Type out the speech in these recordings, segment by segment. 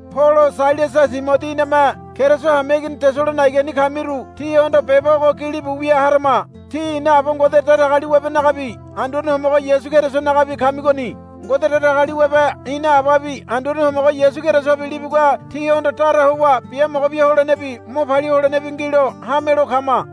Polo Sailasa Timodi iname Keriso hameigini Tesalonaigani kamiru tíhondo beba ogo gilibu wia harama. Tí ina Aba Ngode Datagaliwabenagabi Anduane Homogo Yasu Kerisonagabi kamigoni. Ngode Datagaliwabe ina Ababi Anduane Homogo Yasu Kerisobi libugua tíhondo dara howa biamogo bia holenebi mo palia holenebi ngilo hamelo kama.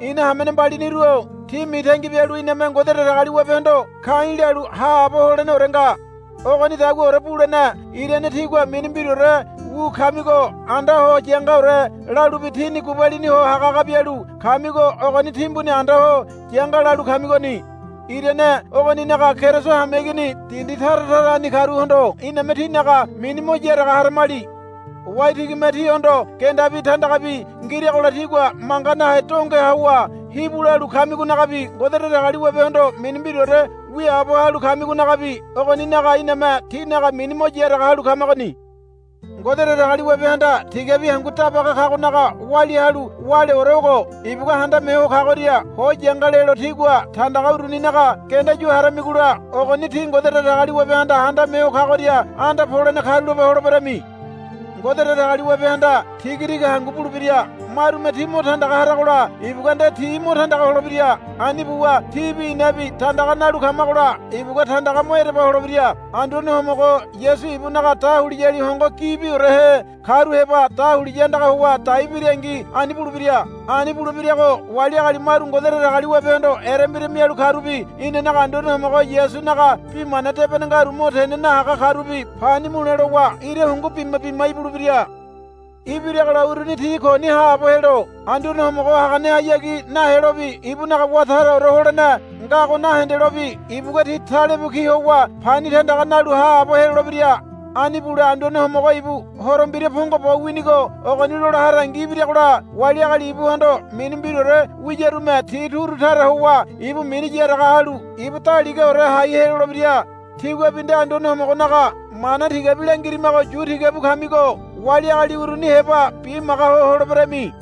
Ina hamene mbaliniru-o tí mitangi bialu iname Ngode Datagaliwabehondo ka̱i̱ lalu haabo holeneore nga. Ogonidaguaore bulene irane tígua mini mbiraore wu kamigo anda ho yangaore lalubi tíni gubalini ho hagahaga bialu kamigo ogoni timbuni anda ho yanga lalu kamigoni. Irane ogoninaga Keriso hameigini dindi tara tarani karuhondo iname tínaga mini mo yaraga haramali. Waitigime tíhondo gendabi tandagabi ngiragola tígua manga nahe donge howa hibu lalu kamigonagabi Ngode Datagaliwabehondo mini mbiraore wiaabo halu kamigonagabi ogoninaga iname tínaga mini mo yaraga halu kamagoni. Ngode Datagaliwabehanda tigabi hangu dabaga kagonaga walia halu wáleore ogo. Ibugua Handame Ho Kagoria ho yanga lelo tígua tandaga uruninaga genda yu haramigola ogoni tí Ngode Datagaliwabehanda Handame Ho Kagoria anda polene karulape holeberami. Ngode Datagaliwabehanda tiga tiga hangu bulebira. Marume tí mo tandaga haragola ibugua nde ti mo tandaga holebira. Ani buwa tíbi inabi tandaga nalu kamagola ibugua tandaga mo ereba holebira. Anduane Homogo Yasu ibunaga dahuliyali hongo gibiorehe karu heba dahuliya andaga howa dai birangi ani bulebira. Ani bulebirago wali agali maru Ngode Datagaliwabehondo erembira mialu karubi inanaga Anduane Homogo Yasunaga Bi Mana Debene ngaru mo tene nahaga karubi pani mule lowa ira hungu bima bima ibulebira. Ibiragola uruni ti koni haabo helo Anduane Homogo haganehayagi nahelobi ibunaga wá taraore holene ngago nahendelobi ibugua ti talebu ki howa pani tandaga nalu haabo helolebira. Ani bule Anduane Homogo ibu Horo Mbira pongo bo winigo ogoni lola harangi ibiragola wali agali ibuhondo mini mbiraore wiyarume ti turu tara howa ibu mini yaraga halu ibu daligaore hai helolebira. Tíguabi nde Anduane Homogonaga mana tigabi langirimago yu tigabu kamigo wali agali uruni heba bimaga ho holeberami.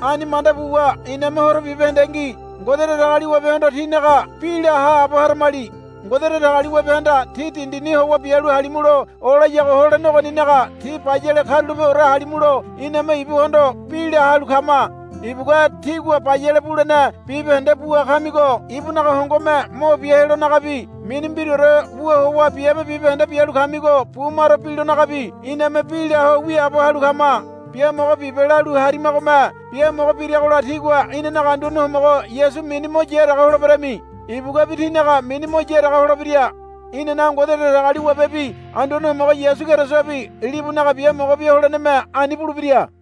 Ani manda buwa iname horo bibahendengi Ngode Datagaliwabehondo tínaga bi la haabo haramali. Ngode Datagaliwabehanda tí dindini howa bialu halimulo olayago holene ogoninaga tí bayale karulapeore halimulo iname ibuhondo bi la halu kama. Ibugua tígua bayale bulene bibahende bua kamigo ibunaga hongome mo bia helonagabi mini mbiraore wu howa biabe bibahende bialu kamigo bumaro bilonagabi iname bi la ho wiaabo halu kama. Biamogo bibe, lalu harimagome biamogo biragola tígua inanaga Anduane Homogo Yasu mini mo yaraga holeberami. Ibuguabi tínaga mini mo yaraga holebira. Inanaga Ngode Datagaliwabebi Anduane Homogo Yasu Kerisobi libunaga biamogo bia holeneme ani bulebira.